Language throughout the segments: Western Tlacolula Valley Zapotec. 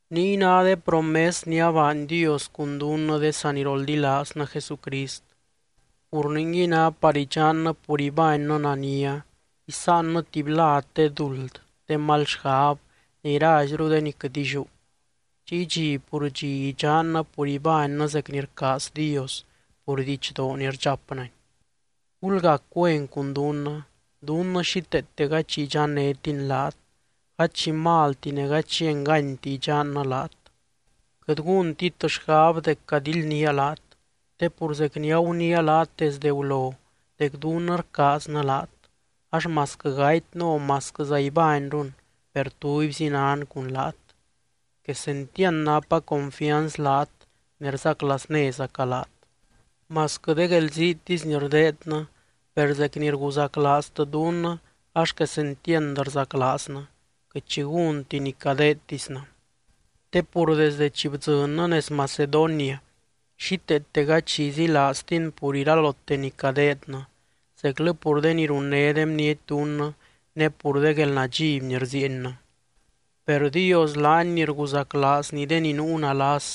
Niy ná de promes ni abaany Dios cun dunnɨ de saniroldilaaznɨ Jesucrist. Pur ningui ná par idxannɨ pur ibánnɨ nania, isáanɨ tuby lad de duld, de mal xgab, ne iraizru de ni quɨt illiú. Chiy dxi pur dxi idxannɨ pur ibánnɨ zec ni rcaaz Dios pur didxdoo ni rdxapnɨny. ¡Gulgac güen cun dunnɨ! Dunnɨ xíteete gady xi idxannétin laat, gady xi malti ne gady xi enganyti idxannɨ laat. Quɨt gúntit xgab dec cadildnía laat, te pur zec ni aguniia laat desde gulo dec dunnɨ rcaaznɨ laat, ax masquɨ gatynɨ o masquɨ ibányrun per tubyzi nan cun laat. Quesentiand napa confianz laat ne rzaclaaznézaca laat. Masquɨ de guelziitisy ni rdeednɨ, per zec ni rguzaclaaztɨ dunnɨ ax quesentiand rzaclaaznɨ, quɨt xi gúnti ni cadeedtisnɨ. Te pur desdɨ chi bdzɨnnɨ nez Macedonia xíteete gady xi izilaaztin pur iralote ni cadeednɨ, zeclɨ pur de ni runné de bniety dunnɨ ne pur de guelnadxiby ni rziiennɨ. Per Dios laany ni rguzaclaazny de ni nuu nalas,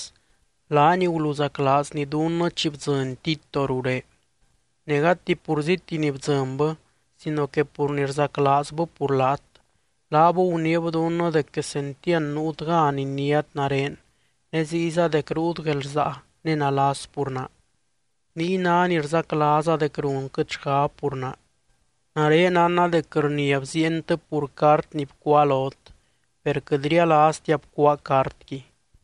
laany guluzaclaazny dunnɨ chi bdzɨny Tito ruré. Ne gati purzíti ni bdzɨnbɨ sino que pur ni rzaclaazbɨ pur laat. Laab guniib dunnɨ dec quesentiand nuut gan iniát nare, ne ziyza dec ruut guelrsaa ne nalas pur naa. Niy ná ni rzaclaaza dec runquɨt xgab pur naa. Nare nánna dec rnia bziientɨ pur cart ni bcuáa lot, per quɨt rialaaztia bcuáa cartqui.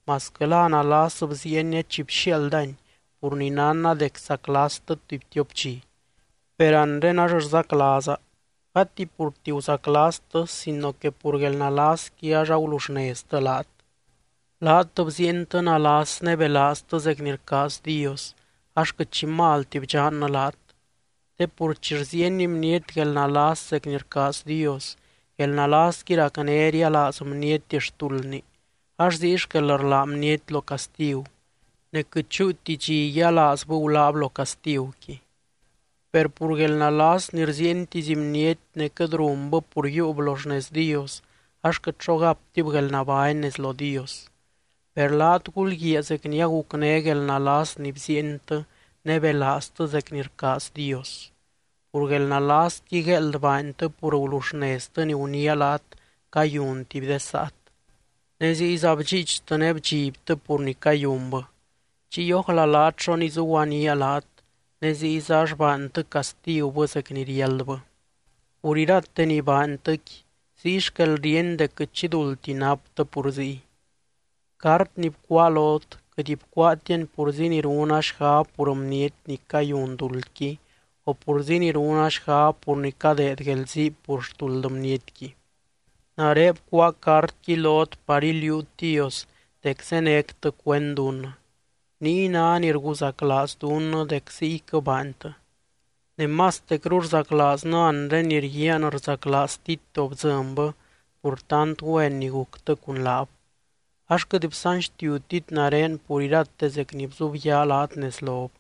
Masquɨ la nalas bziienia chi bxiaaldani pur ni nánna dec saclastɨ tuby tiop dxi, per anre ax rzaclaaza, gati purti guzaclastɨ sino que pur guelnalasqui ax aguluxneztɨ laat. Laat bziientɨ nalas ne belaaztɨ zec ni rcaaz Dios, ax quɨt xi malti bdxannɨ laat. Te pur chi rziieny bniety guelnalas zec ni rcaaz Dios, guelnalasqui racné rialaaz bniety xtuldni ax ziy xquel rlá bniety lo castigu, ne quɨt chúuti dxi yialaazbɨ guláb lo castiguqui. Per pur guelnalas ni rziientisy bniety ne quɨt runbɨ pur yiiub lo xnez Dios, ax quɨt xo gaptib guelnabány nez lo Dios. Per laat gulguiaa zec ni agucné guelnalas ni bziientɨ ne belaaztɨ zec ni rcaaz Dios. Pur guelnalasqui gueeld baantɨ pur gulexneztɨ ni guniia laat cayun tuby de saat, ne ziyza bdxiichtɨ ne bdxibtɨ pur ni cayunbɨ. Chiy ójla laat xo nizuguaníaa laat, ne ziyza ax baantɨ castigubɨ zec ni riáldbɨ. Pur irate ni baantɨqui, ziy xquel ríeny dec quɨt xi duldti naptɨ pur ziy. Cart ni bcuáa lot, quɨt bcuáatiani purzi ni runa xgab pur bniety ni cayun duldqui o purzi ni runa xgab pur ni cadeed guelzii pur xtuld bnietqui. Nare bcuáa cartqui lot par iliuut Dios dec zénectɨ cuend dunnɨ. Niy ná ni rguzaclaaz dunnɨ dec ziyquɨ baantɨ. Ne mastecru rzaclaaznɨ anre ni rguiaan rzaclaaz Tito bdzɨnbɨ pur tant güen ni guctɨ cun laab. Ax quɨt bsanxtiutit nare pur irate zec ni bzubyaa laat nez lob.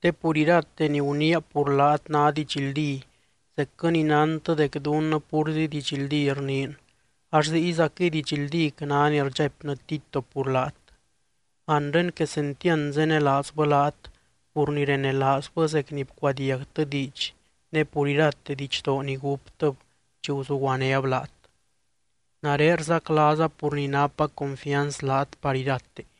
Te pur irate ni guniia pur laat ná didxldí zecquɨ ni nántɨ dec dunnɨ púrzi didxldí rniin, ax ziyzaquɨy didxldíc ná ni rdxaipnɨ Tito pur laat. Anre quesentiand zenelaazbɨ laat pur ni renelaazbɨ zec ni bcuadiagtɨ diidx ne pur irate didxdoo ni gúptɨb chi guzuguanéb laat. Nare rzaclaaza pur ni napa confianz laat par irate.